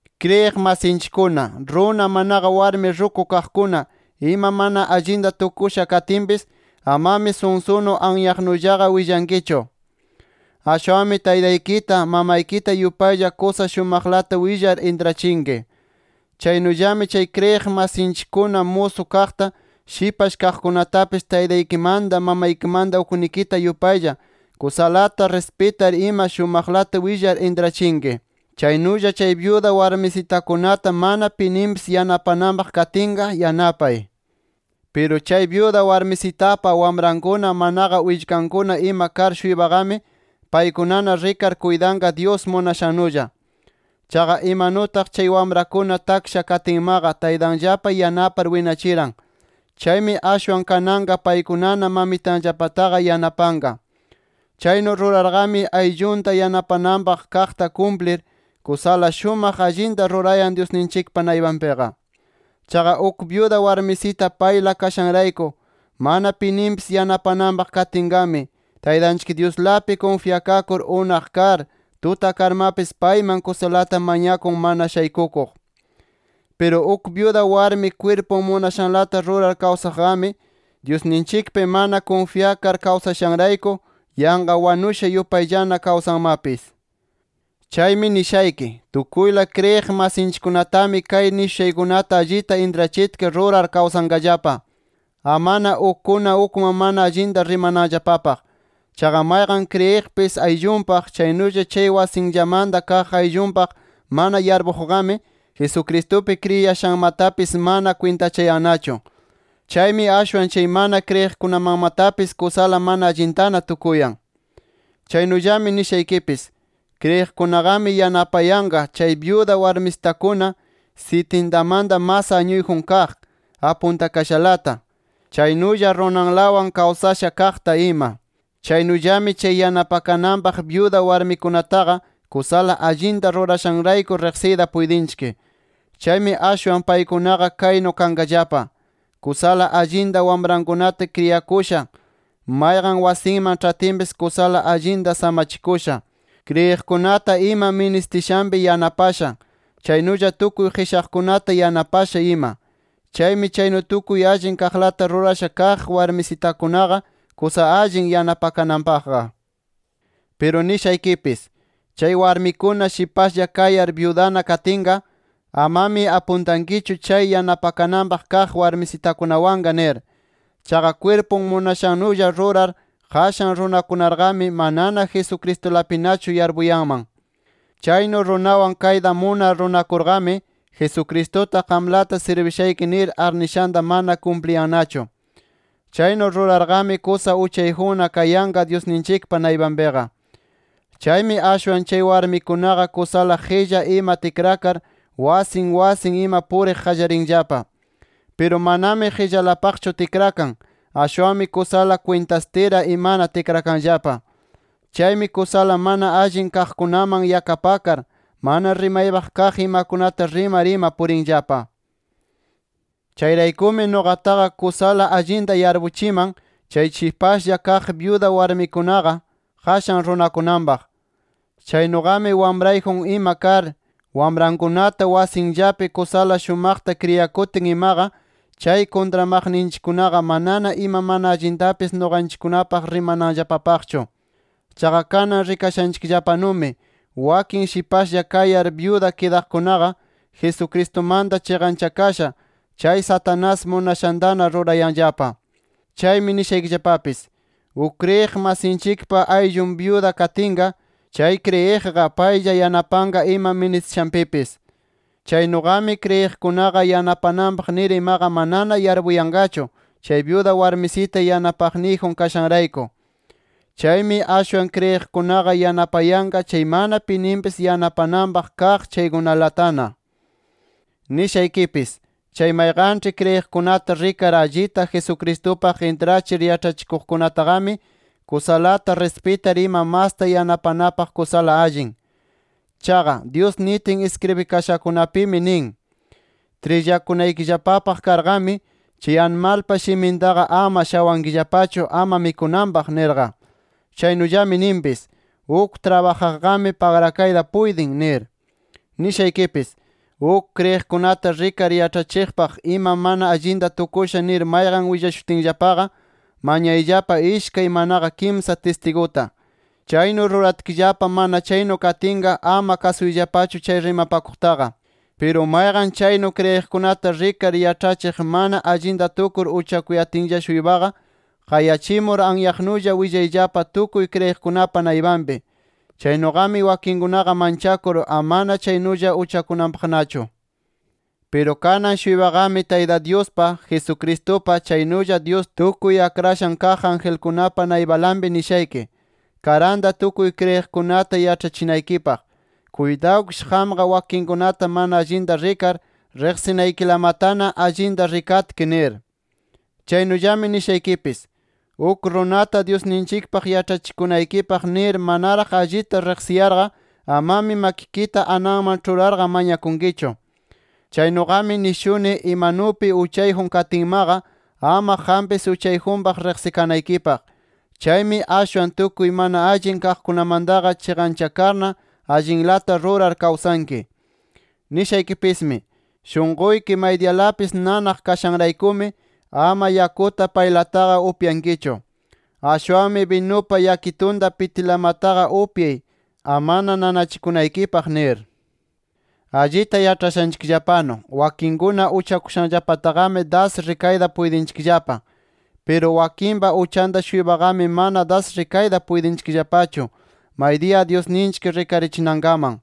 Kriyiq masinchikkuna, runa manaqa warmi ruku kaqkuna ima mana allinta tukusha katinpis amami sunsunu anyaqnullaqa willankichu. Ashwanmi taytaykita, mamaykita yupaylla kusa shumaqlata willar intrachinki. Chaynullami chay kriyiq masinchikkuna musu kaqta, shipash kaqkunatapis taytaykimanta, mamaykimanta uknikita yupaylla kusalata rispitar ima shumaqlata willar intrachinki. Chaynulla chay byuda warmisitakunata mana pininpis yanapananpaq katinqa, yanapay. Piru chay byuda warmisitapa wamrankuna, manaqa willkankuna ima kar-shuypaqami paykunana rikar kuytanqa Dyus munashannulla. Chaqa, imanutaq chay wamrakuna taksha katinmaqa taytanllapa yanapar winachiran. Chaymi ashwan kananqa paykunana mamitanllapataqa yanapanqa. Chaynu rurarqami ayllunta yanapananpaq kaqta kumplir, kusala shumaq allinta rurayan Dyusninchikpa naypanpiqa. Chaqa uk byuda warmisita payla kashanrayku, mana pininpis yanapananpaq katinqami, Taytanchik Dyuslapi kunfyakakur unaq kar, tuta karmapis payman kusalata mañakun mana shaykukuq. Piru uk byuda warmi kwirpun munashanlata rurar kawsaqqami, Dyusninchikpi mana kunfyakar kawsashanrayku yanqa wanusha yupayllana kawsanmapis. Chaymi nishayki: Tukuyla kriyiq masinchikkunatami kay nishushaykunata allita intrachitki rurar kawsanqallapa. Amana ukkuna ukman mana allinta rimananllapapaq. Chaqa mayqan kriyiqpis ayllunpaq, chaynulla chay wasinllamanta kaq ayllunpaq mana yarpuqqami, Jesucristupi kriyiyashanmatapis mana kwintachayannachu. Chaymi ashwan chay mana kriyiqkunamanmatapis kusala mana allintana tukuyan. Chaynulla nishaykipis: Kriyiqkunaqami yanapayanqa chay byuda warmisitakuna sisintamanta mas añuyjun kaq, apuntakashalata. Chaynulla runanlawan kawsasha kaqta ima. Chaynullami chay yanapakananpaq byuda warmikunataqa kusala allinta rurashanrayku riqsiyta puytinchik. Chaymi ashwan paykunaqa kaynu kanqallapa: Kusala allinta wamrankunata kriyakusha, mayqan wasinman ĉhatinpis kusala allinta samachikusha, kriyiqkunata ima ministishanpi yanapasha, chaynulla tukuy qischakaqkunata yanapasha ima. Chaymi chaynu tukuy allin kaqlata rurasha kaq warmisitakunaqa kusala allin yanapakananpaqqa. Piru nishaykipis: Chay warmikuna shipashlla kayar byudana kidatinqa, amami apuntankichu chay yanapakananpaq kaq warmisitakunawanqa nir. Chaqa kwirpun munashannulla rurar qashan runakunarqami, manana Jesucristulapinachu yarpunman. Chaynu runawan kayta munar runakurqami, Jesucristuta qamlata sirbishayki nir arnishanta mana kumpliyannachu. Chaynu rurarqami kusa uchayjunna kayanqa Dyusninchikpa naypanpiqa. Chaymi ashwan chay warmikunaqa kusala qilla ima tikrakar, wasin wasin ima puriq qallarinllapa. Piru manami qillalapaqchu tikrakan, ashwanmi kusala kwintastira imana tikrakanllapa. Chaymi kusala mana allin kaqkunaman yakapakar, mana rimaypaq kaq imakunata rimar ima purinllapa. Chayraykumi nuqataqa kusala allinta yarpuchiman chay shipashlla kaq, byuda warmikunaqa qashan runakunanpaq. Chaynuqami wamrayjun ima kar, wamrankunata wasinllapi kusala shumaqta kriyakutin imaqa, chay kuntramaqninchikkunaqa manana ima mana allintapis nuqanchikkunapaq rimananllapapaqchu. Chaqa kanan rikashanchikllapanumi wakin shipashlla kayar byuda kidaqkunaqa, Jesucristumanta chiqanchakasha chay Satanás munashantana rurayanllapa. Chaymi nishaykipis: Uk kriyiq masinchikpa ayllun byuda kidatinqa, chay kriyiqqa paylla yanapanqa ima ministishanpipis. Chaynuqami, kriyiqkunaqa yanapanapaq nir imaqa manana yarpuyanqachu, chay byuda warmisita yanapaqniyjun kashanrayku. Chaymi ashwan, kriyiqkunaqa yanapayanqa chay mana pininpis yanapananpaq kaq chaykunalatana. Nishaykipis: Chay mayqanĉhi kriyiqkunata rikar allita Jesucristupaq intrachir yaĉhachikuqkunataqami, kusalata rispitar ima masta yanapanapaq kusala allin. Chaqa, Dyus nitin iskribikashakunapimi nin: “Trillakunaykillapapaq karqami, chay animalpa shimintaqa ama shawankillapachu, ama mikunanpaq” nirqa. Chaynullami ninpis: “Uk trabajaqqami pagrakayta puytin” nir. Nishaykipis: Uk kriyiqkunata rikar yaĉhachiqpaq ima mana allinta tukusha nir mayqan willashutinllapaqa, mañayllapa ishkay, manaqa kimsa tistiguta. Chaynu ruratkillapa mana chaynu katinqa ama kasuyllapachu chay rimapakuqtaqa. Piru mayqan chaynu kriyiqkunata rikar yaĉhachiq mana allinta rurar uchakuyatinlla-shuypaqa, qayachimur anyaqnulla willayllapa tukuy kriyiqkunapa naypanpi. Chaynuqami wakinkunaqa manchakur amana chaynulla uchakunanpaqnachu. Piru kanan-shuypaqami Tayta Dyuspa, Jesucristupa, chaynulla Dyus tukuy akrashan kaq angelkunapa naypalanpi nishayki: Karanta tukuy kriyiqkunata yaĉhachinaykipaq. Kuytawkish qamqa wakinkunata mana allinta rikar, riqsinaykilamatana allinta rikatki nir. Chaynullami nishaykipis: Uk runata Dyusninchikpaq yaĉhachikunaykipaq nir manaraq allita riqsiyarqa amami makikita ananman ĉhurarqa mañakunkichu. Chaynuqami nishuni imanupi uchayjun katinmaqa ama qampis uchayjunpaq riqsikanaykipaq. Chaymi ashwan tukuy mana allin kaqkunamantaqa chiqanchakarna allinlata rurar kawsanki. Nishaykipismi: Shunquyki maydiyalapis nanaq kashanraykumi ama yakuta paylataqa upyankichu. Ashwanmi binupa yakitunta pitilamataqa upyay, amana nanachikunaykipaq nir. Allita yaĉhashanchikllapanu, wakinkuna uchakushanllapataqami das rikayta puytinchikllapa. Piru wakinpa uchanta-shuypaqami mana das rikayta puytinchikllapachu, maydiya Dyusninchik rikarichinankaman.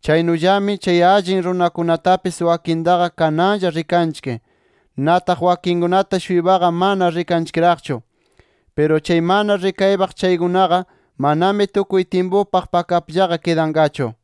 Chaynullami, chay allin ruraykunatapis wakintaqa kananlla rikanchik. Nataq wakinkunata-shuypaqa mana rikanchikraqchu. Piru, chay mana rikaypaq chaykunaqa, manami tukuy tyimpupaq pakapllaqa kidanqachu.